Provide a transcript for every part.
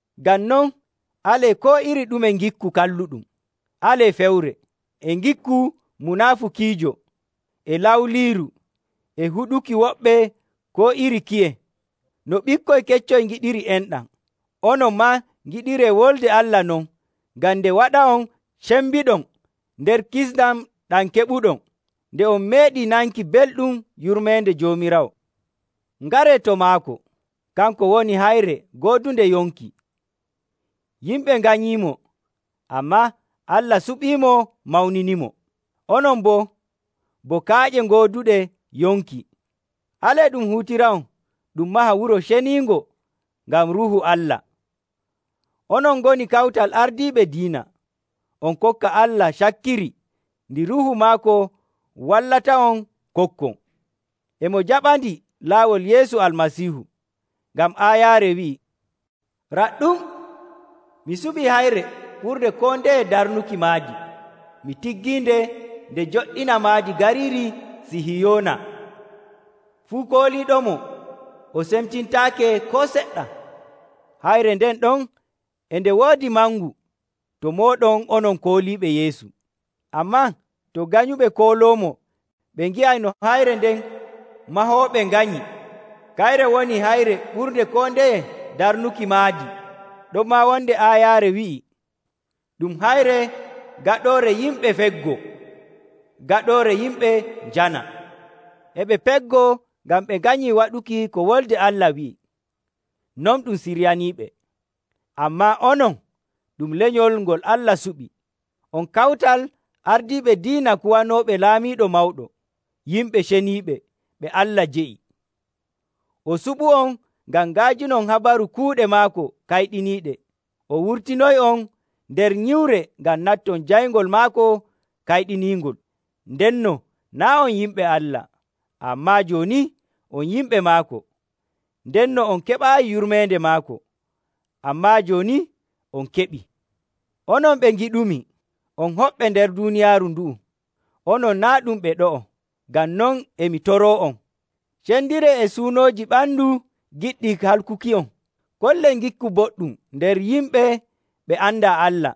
Ngam non, alee koo iri ɗume ngikku kalluɗum. Alee fewre, e ngikku munaafukiijo, e lawliiru, e huɗuki woɓɓe koo iri kiye. No ɓikkoy keccoy ngiɗiri enɗam, onon maa ngiɗiree Wolde Allah non ngam nde waɗa'on cembiɗon nder kisndam ɗam keɓuɗon, nde on meeɗii nanki belɗum yurmeende Joomiraawo. Ngaree to maako. Kanko woni hayre goodunde yonki. Yimɓe nganyiimo, ammaa Allah suɓiimo mawniniimo. Onon boo, bo kaaƴe gooduɗe yonki, alee ɗum huutira'on ɗum maha wuro ceniingo ngam Ruuhu Allah. Onon ngoni kawtal ardiiɓe diina, on kokka Allah cakkiri ndi Ruuhu maako wallata'on kokkon. E mo jaɓandi laawol Yeesu Almasiihu. Ngam aayaare wi'ii, “Raɗɗum, mi suɓii hayre ɓurnde koo ndeye darnuki maadi, mi tiggiinde nde joɗɗina maadi gariiri Sihiyoona; fuu kooliiɗomo o semtintaake koo seɗɗa.” Hayre nden ɗon e nde woodi mangu to mooɗon onon kooliiɓe Yeesu. Ammaa to ganyuɓe kooloomo ɓe ngi'ay no, “Hayre nde mahooɓe nganyi, kayre woni hayre ɓurnde koo ndeye darnuki maadi.” Ɗonmaa wonde aayaare wi'ii, “Ɗum hayre gaɗoore yimɓe feggoo, gaɗoore yimɓe njana.” E ɓe peggoo ngam ɓe nganyii waɗuki ko Wolde Allah wi'i. Non ɗum siryaniiɓe. Ammaa onon ɗum lenyol ngol Allah suɓi, on kawtal ardiiɓe diina kuwanooɓe laamiiɗo mawɗo, yimɓe ceniiɓe, ɓe Allah jeyi. O suɓu'on ngam nga'ajinon habaru kuuɗe maako kayɗiniiɗe. O wurtinoy'on nder nyiwre ngam natton jayngol maako kayɗiniingol. Ndenno naa' on yimɓe Allah, ammaa jooni on yimɓe maako. Ndenno on keɓaayi yurmeende maako, ammaa jooni on keɓii. Onon ɓe ngiɗumi, on hoɓɓe nder duuniyaaru ndu'u, onon naa' ɗum ɓe ɗo'o. Ngam non e mi toroo'on, cendiree e suunooji ɓandu giɗɗi halkuki'on. Kollee ngikku boɗɗum nder yimɓe ɓe andaa Allah,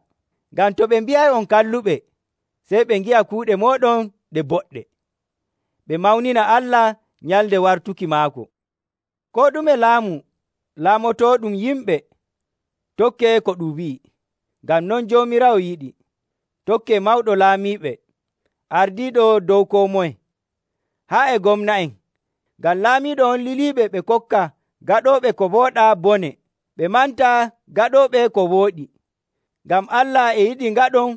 ngam to ɓe mbi'ay on kalluɓe, sey ɓe ngi'a kuuɗe mooɗon ɗe boɗɗe, ɓe mawnina Allah nyalnde wartuki maako. Koo ɗume laamu laamotooɗum yimɓe, tokkee ko ɗum wi'i, ngam non Joomiraawo yiɗi. Tokkee mawɗo laamiiɓe, ardiiɗo dow koo moye, haa e gomna'en, ngam laamiiɗo on liliɓe ɓe kokka gaɗooɓe ko wooɗaa bone, ɓe manta gaɗooɓe ko wooɗi. Ngam Allah e yiɗi ngaɗon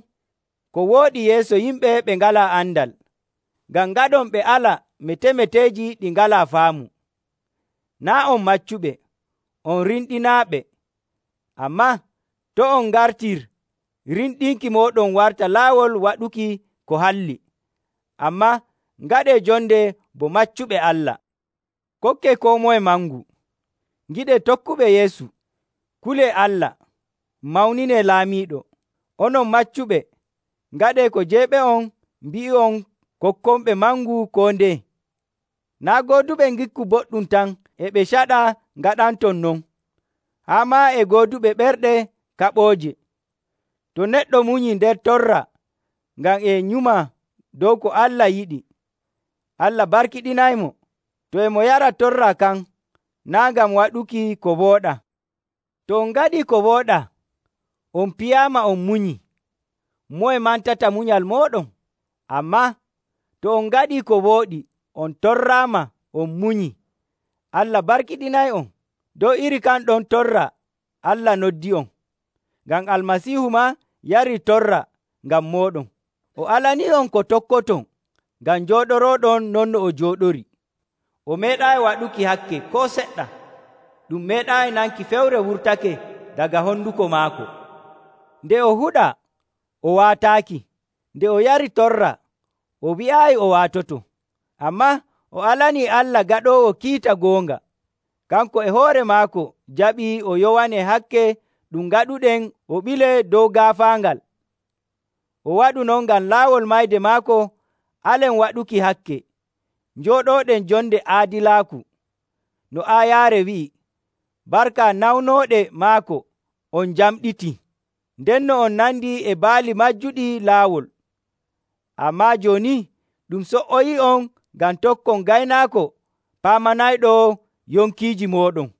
ko wooɗi yeeso yimɓe ɓe ngalaa andal, ngam ngaɗon ɓe ala metemeteeji ɗi ngalaa faamu. Naa' on maccuɓe, on rimɗinaaɓe, ammaa to' on ngartir rimɗinki mooɗon warta laawol waɗuki ko halli, ammaa ngaɗee jonde bo maccuɓe Allah. Kokkee koo moye mangu, ngiɗee tokkuɓe Yeesu. Kulee Allah, mawninee laamiiɗo. Onon maccuɓe, ngaɗee ko jeyɓe'on mbi'i'on kokkonɓe mangu koo ndeye. Naa' gooduɓe ngikku boɗɗum tan e ɓe caɗaa ngaɗanton non, haa maa e gooduɓe ɓerɗe kaɓooje. To neɗɗo munyii nder torra ngam e nyuma dow ko Allah yiɗi, Allah barkiɗinaymo, to e mo yara torra kan naa' ngam waɗuki ko wooɗaa. To on ngaɗii ko wooɗaa on piyaama on munyii, moye mantata munyal mooɗon? Ammaa to on ngaɗii ko wooɗi on torraama on munyii, Allah barkiɗinay'on. Dow iri kan ɗon torra Allah noddi'on, ngam Almasiihu maa yarii torra ngam mooɗon. O alanii'on ko tokkoton ngam njooɗorooɗon no o jooɗorii. O meeɗaayi waɗuki hakke koo seɗɗa, ɗum meeɗaayi nanki fewre wurtake daga honduko maako. Nde o huɗaa, o waataaki. Nde o yari torra, o wi'aayi o waatoto, ammaa o alanii Allah gaɗoowo kiita goonga. Kanko e hoore maako jaɓi o yowanee hakke ɗum ngaɗuɗen o ɓilee dow gaafaangal. O waɗu non ngam laawol mayde maako alen waɗuki hakke, njooɗooɗen jonde aadilaaku. No aayaare wi'i, “Barka nawnooɗe maako on njamɗitii.” Ndenno on nandii e baali majjuɗi laawol, ammaa jooni ɗum so''oyii'on ngam tokkon Gaynaako Paamanayɗo yonkiiji mooɗon.